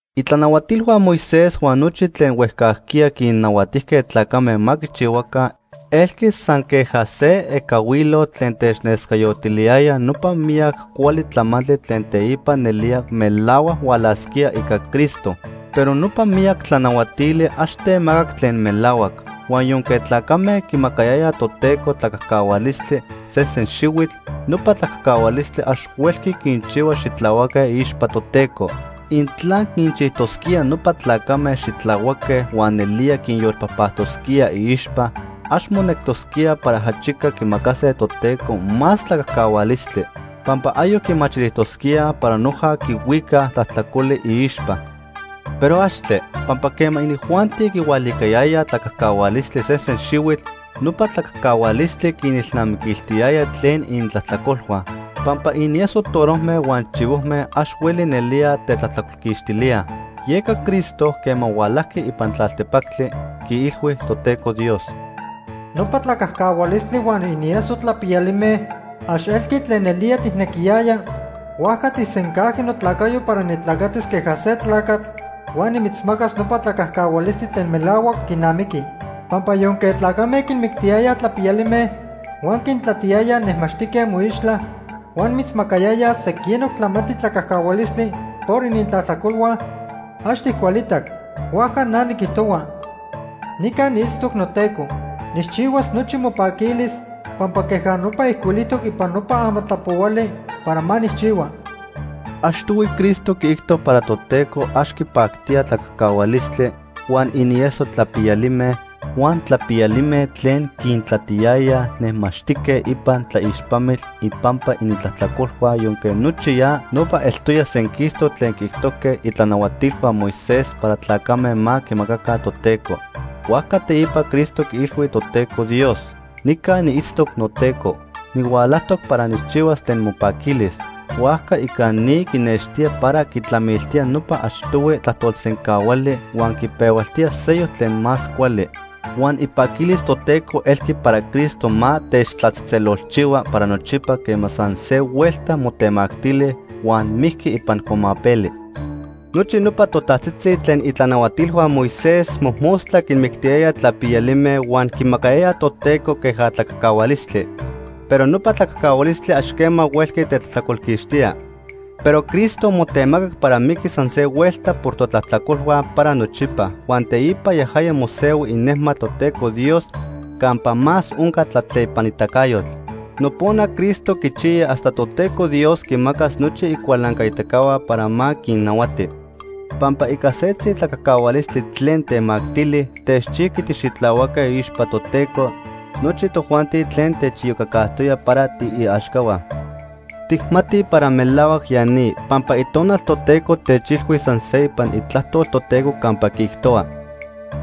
Itlanahuatilhua Moisés huan nochi tlen huejcajquiya quinnahuatijque tlacame ma quichihuaca elqui san queja se ecahuilotl tlen technescayotiliyaya nopa miyac cuali tlamantli tlen teipa nelía melahuac hualasquía ica Cristo. Pero nopa miyac tlanahuatili ax temacac tlen melahuac. Huan yonque tlacame quimacayayaj Toteco tlacajcahualistli sesen xihuitl, nopa tlacajcahualistli ax huelqui quinchihua xitlahuaque iixpa Toteco. Intla quinchijtosquía nopa tlacame xitlahuaque huan nelía quinyolpajpactosquía iixpa, ax monectosquía para ajachica quimacase Toteco más tlacajcahualistli, pampa ayoc quimachilijtosquíaj para noja quihuicaj tlajtlacoli iixpa. ¡Pero axtle! Pampa quema inijuanti quihualicayayaj tlacajcahualistli sesen xihuitl, nopa tlacajcahualistli quinilnamiquiltiyaya tlen inintlajtlacolhua. Pampa inieso torojme huan chivojme ax hueli nelía tetlajtlacolquixtilía. Yeca Cristo, quema hualajqui ipan tlaltepactli, quiilhui Toteco Dios: “Nopa tlacajcahualistli huan inieso tlapiyalime ax elqui tlen nelía tijnequiyaya, huajca tijsencajqui notlacayo para nitlacatis queja se tlacatl huan nimitzmacas nopa tlacajcahualistli tlen melahuac quinamiqui. Pampa yonque tlacame quinmictiyayaj tlapiyalime huan quintlatiyayaj nejmaxtique moixtla, huan mitzmacayayaj sequinoc tlamantli tlacajcahualistli por inintlajtlacolhua, ax tijcualitac. Huajca na niquijtohua: ‘Nica niitztoc noTeco. Nijchihuas nochi mopaquilis pampa queja nopa ijcuilijtoc ipan nopa Amatlapohuali para ma nijchihua.’” Achtohui Cristo quiijto para Toteco ax quipactía tlacajcahualistli, huan inieso tlapiyalime, huan tlapiyalime tlen quintlatiyayaj nejmaxtique ipan tlaixpamitl ipampa inintlajtlacolhua yonque nochi ya nopa eltoya senquistoc tlen quiijtojque itlanahuatilhua Moisés para tlacame ma quimacaca Toteco. Huajca teipa Cristo quiilhui Toteco Dios: “Nica niitztoc noTeco. Nihualajtoc para nijchihuas tlen mopaquilis.” Huajca ica ni quinextía para quitlamiltía nopa achtohui tlajtolsencahuali huan quipehualtía seyoc tlen más cuali. Huan ipaquilis Toteco elqui para Cristo ma techtlatzejtzelolchihua para nochipa quema san se huelta motemactili huan mijqui ipan cuamapeli. Nochi nopa totajtzitzi tlen itlanahuatilhua Moisés mojmostla quinmictiyayaj tlapiyalime huan quimacayayaj Toteco queja tlacajcahualistli. Pero nopa tlacajcahualistli ax quema huelqui tetlajtlacolquixtía. Pero Cristo motemacac para miquis san se huelta por totlajtlacolhua para nochipa, huan teipa yajaya mosehui inejmatl Toteco Dios campa más onca tlatlepanitacayotl. Nopona Cristo quichiya hasta Toteco Dios quimacas nochi icualancaitacahua para ma quinnahuati. Pampa ica setzi tlacajcahualistli tlen temactili, techchijqui tixitlahuaque iixpa Toteco nochi tojuanti tlen techiyocacajtoya para tiiaxcahua. Tijmatij para melahuac ya ni, pampa Itonal Toteco techilhui san se ipan Itlajtol Toteco campa quiijtohua: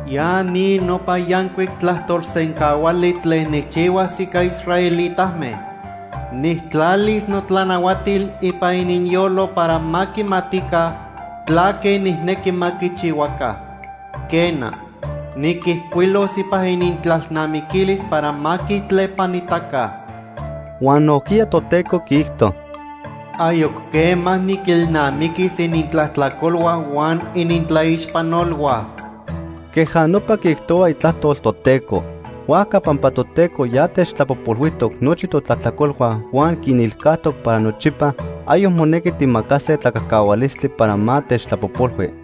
“Ya ni nopa yancuic tlajtolsencahuali tlen nijchihuas ica israelitame. Nijtlalis notlanahuatil ipan ininyolo para ma quimatica tlaque nijnequi ma quichihuaca. Quena, niquijcuilos ipan inintlalnamiquilis para ma quitlepanitaca.” Huan nojquiya Toteco quiijto: “Ayoc quema niquilnamiquis inintlajtlacolhua huan inintlaixpanolhua.” Queja nopa quiijtohua Itlajtol Toteco. Huajca pampa Toteco ya techtlapojpolhuijtoc nochi totlajtlacolhua huan quinilcajtoc para nochipa, ayoc monequi tijmacase tlacajcahualistli para ma techtlapojpolhui.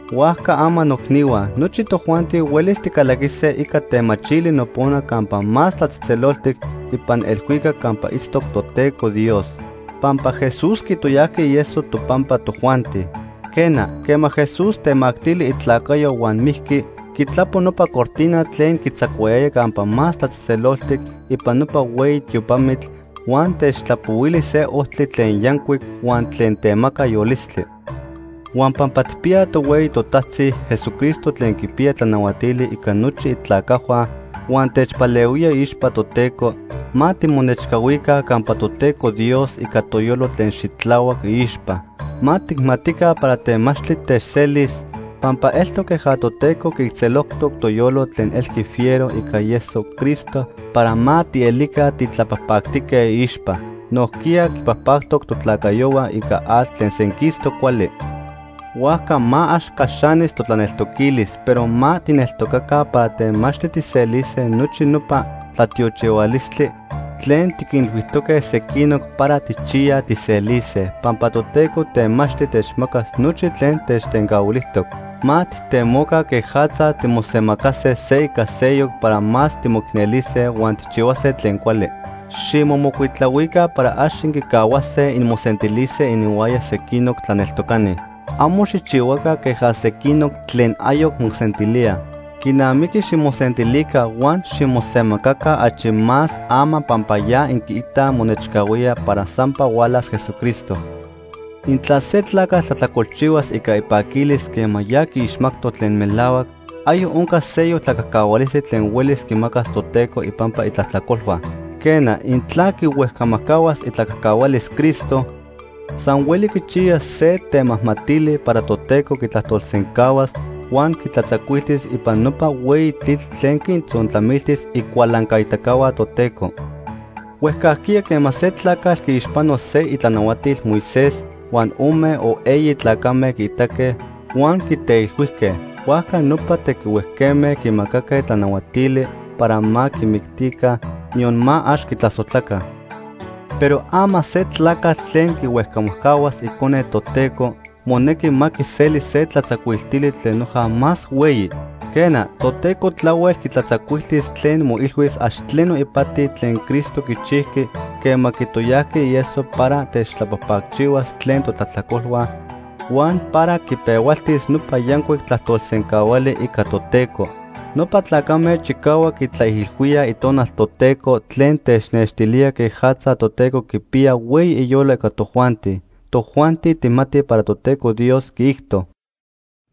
Huajca ama noicnihua, nochi tojuanti huelis ticalaquise ica temachili nopona Campa Más Tlatzejtzeloltic ipan elhuicac campa itztoc Toteco Dios, pampa Jesús quitoyajqui ieso topampa tojuanti. Quena, quema Jesús temactili itlacayo huan mijqui, quitlapo nopa cortina tlen quitzacuayaya Campa Más Tlatzejtzeloltic ipan nopa hueyi tiopamitl huan techtlapohuili se ojtli tlen yancuic huan tlen temaca yolistli. Huan pampa tijpiyaj tohueyi totajtzi, Jesucristo, tlen quipiya tlanahuatili ica nochi itlacajhua huan techpalehuía iixpa Toteco, ma timonechcahuica campa Toteco Dios ica toyolo tlen xitlahuac iixpa. Ma tijmatica para temachtli techselis, pampa eltoc queja Toteco quiijtzelojtoc toyolo tlen elqui fiero ica ieso Cristo para ma tielica titlapajpactique iixpa. Nojquiya quipajpactoc totlacayohua ica atl tlen senquistoc cuali. Huajca ma ax caxanis totlaneltoquilis, pero ma tijneltocaca para temachtli tijselise nochi nopa tlatiochihualistli tlen tiquinilhuijtoque sequinoc para tijchiyaj tijselise, pampa Toteco temachtli techmacas nochi tlen techtencahuilijtoc. Ma tijtemoca quejatza timosemacase se ica seyoc para más timoicnelise huan tijchihuase tlen cuali. Ximomocuitlahuica para ax inquicahuase inmosentilise ininhuaya sequinoc tlaneltocani. Amo xijchihuaca queja sequinoc tlen ayoc mosentilíaj. Quinamiqui ximosentilica huan ximosemacaca achi más ama pampa ya inquiitaj monechcahuía para sampa hualas Jesucristo. Intla se tlacatl tlajtlacolchihuas ica ipaquilis quema ya quiixmajtoc tlen melahuac, ayoc oncas seyoc tlacajcahualistli tlen huelis quimacas Toteco ipampa itlajtlacolhua. Quena, intla quihuejcamajcahuas itlacajcahualis Cristo, san hueli quichiyas se temajmatili para Toteco quitlajtolsencahuas huan quitlatzacuiltis ipan nopa hueyi tlitl tlen quintzontlamiltis icualancaitacahua Toteco. Huejcajquiya quema se tlacatl quiixpano se itlanahuatil Moisés huan ome o eyi tlacame quiitaque huan quiteilhuijque, huajca nopa tequihuejme quimacaque tlanahuatili para ma quimictica, niyon ma ax quitlasojtlaca. Pero ama se tlacatl tlen quihuejcamajcahuas Icone Toteco, monequi ma quiseli se tlatzacuiltili tlen noja más hueyi. Quena, Toteco tlahuel quitlatzacuiltis tlen moilhuis ax tleno ipati tlen Cristo quichijqui quema quitoyajqui ieso para techtlapajpacchihuas tlen totlajtlacolhua huan para quipehualtis nopa yancuic tlajtolsencahuali ica Toteco. Nopa tlacame chicahuac quitlaijilhuíaj Itonal Toteco tlen technextilía quejatza Toteco quipiya hueyi iyolo ica tojuanti. Tojuanti tijmatij para Toteco Dios quiijto: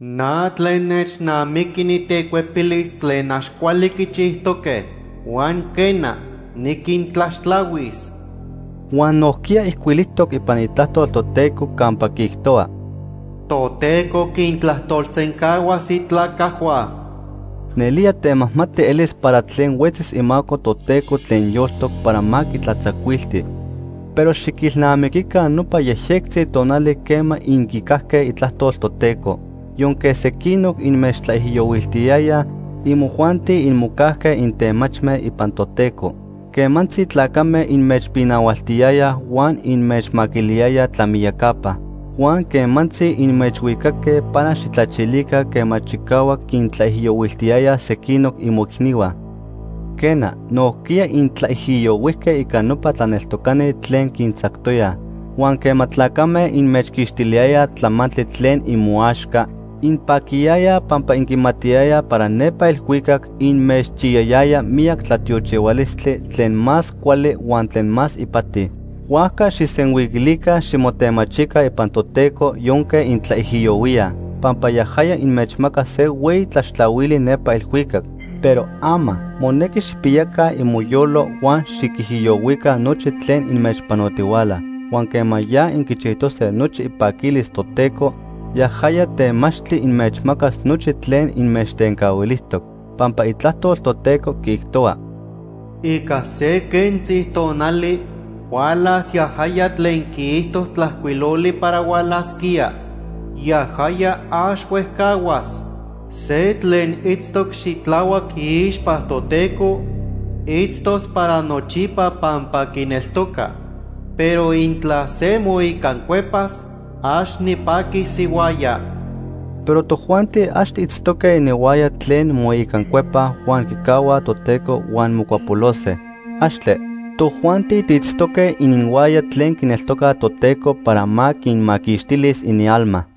“Na tlen nechnamiqui nitecuepilis tlen ax cuali quichijtoque huan quena, niquintlaxtlahuis.” Huan nojquiya ijcuilijtoc ipan Itlajtol Toteco campa quiijtohua: “Toteco quintlajtolsencahuas itlacajhua.” ¡Nelía temajmati elis para tlen huetzis imaco Toteco tlen yoltoc para ma quitlatzacuilti! Pero xiquilnamiquica nopa yejyectzi tonali quema inquicajque itlajtol Toteco. Yonque sequinoc inmechtlaijiyohuiltiyayaj, imojuanti inmocajque intemachme ipan Toteco. Quemantzi tlacame inmechpinahualtiyayaj huan inmechmaquiliyayaj tlamiyacapa. Huan quemantzi inmechhuicaque para xijtlachilica quema chicahuac quintlaijiyohuiltiyayaj sequinoc imoicnihua. Quena, nojquiya intlaijiyohuijque ica nopa tlaneltocani tlen quintzactoyaj. Huan quema tlacame inmechquixtiliyayaj tlamantli tlen imoaxca, inpaquiyayaj pampa inquimatiyayaj para nepa elhuicac inmechchiyayaya miyac tlatiochihualistli tlen más cuali huan tlen más ipati. Huajca xijsenhuiquilica ximotemachica ipan Toteco yonque intlaijiyohuíaj, pampa yajaya inmechmacas se hueyi tlaxtlahuili nepa elhuicac. Pero ama, monequi xijpiyaca imoyolo huan xiquijiyohuica nochi tlen inmechpanotihuala, huan quema ya inquichijtose nochi ipaquilis Toteco, yajaya temachtli inmechmacas nochi tlen inmechtencahuilijtoc. Pampa Itlajtol Toteco quiijtohua: “Ica se quentzi tonali hualas yajaya tlen quiijto tlajcuiloli para hualasquía. Yajaya, ax huejcahuas. Se tlen itztoc xitlahuac iixpa Toteco, itztos para nochipa pampa quineltoca. Pero intla se moicancuepas, ax nipaquis ihuaya.” Pero tojuanti ax tiitztoque ininhuaya tlen moicancuepaj huan quicahuaj Toteco huan mocuapolose. ¡Axtle! Tojuanti tiitztoque ininhuaya tlen quineltocaj Toteco para ma quinmaquixtilis inialma.